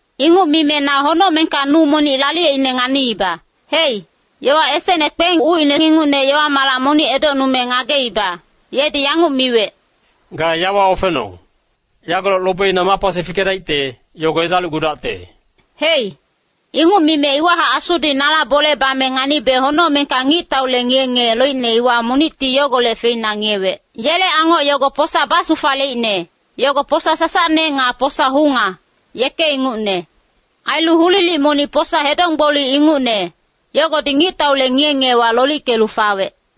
Inguc mime na honocmengka nu monic laliyeicne nganiiba. Hei, yowa esecne kpeng ucine ingucne yowa-malac monic edocnume ngageiba, yedi yanguc miwec, “Ga yawa ofenong. Yagolec lobeina ma pasi fikedaicte, yogo edalicgudacte.” Hei, inguc mime iwahac Asudi nala bole bame nganibe honocmengka ngictaule ngiye-ngiye loicne iwa monicti yogolec feina ngiyewec. Yele angoc yogo posa basufaleicne, yogo posa sasacne nga posa hunga, yeke ingucne. Ailu hulilic monic posa hedonggboli ingucne, yogodi ngictaule ngiye-ngiyewa lolickelu fawec.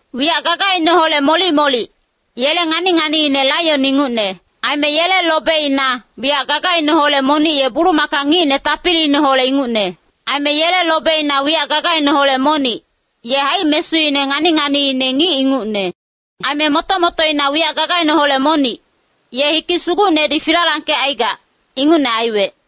Wiyac gagaineholec molic-molic, yele ngani-nganiine laion ingucne. Aime yele lobeina, wiyac gagaineholec monic ye bulumaka ngicne tapiliineholec ingucne. Aime yele lobeina wiyac gagaineholec monic, ye haic-mesuine ngani-nganiine ngic ingucne. Aime moto-motoina wiyac gagaineholec monic, ye hikic sugucnedi filalangkecaigac, ingucne aiwec.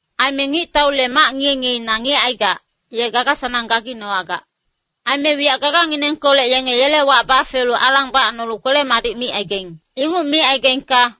Aime ngictaule mac ngiye-ngiyeina ngiyecaigac, ye gaga-sanang gaginowagac. Aime wiyac gaganginengkolec yenge yele wac bafelu alang bacnolu kwele-madic micaigaing. Inguc micaigaingka,